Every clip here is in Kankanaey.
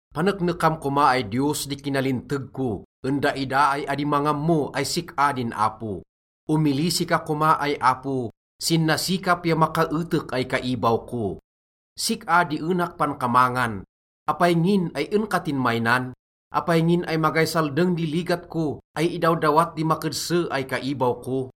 Paneknekam koma ay Diyos di kinalinteg ko en daida ay adi mangammo ay sik-a din Apo. Omilisi ka koma ay Apo sin nasikap ya makaetek ay kaibaw ko. Sik-a di enak pankamangan. Apay ngin ay en ka tinmaynan? Apay ngin ay magay saldeng di ligat ko ay idawdawat di makedse ay kaibaw ko?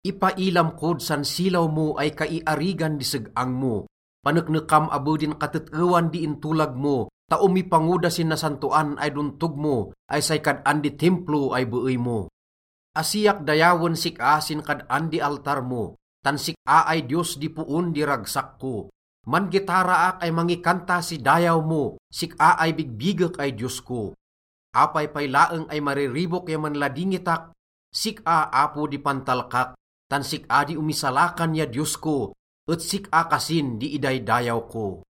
Ipailam kod san silaw mo ay kaiarigan di seg-ang mo, paneknekam abe din katet-ewan di intolag mo, ta omipango da sin nasantoan ay dontog mo ay say kad-an di Timplo ay beey mo. Asiak dayawen sik-a sin kad-an di altar mo, tan sik-a ay Diyos di poon di ragsak ko. Man-gitaraak ay mangikanta si dayaw mo, sik-a ay bigbigek ay Diyos ko. Apay pay laeng ay mariribok ya manladingitak? Sik-a, Apo di pantalkak, tan sik-a di omisalakan ya Diyos ko, et sik-a kasin di idaydayaw ko.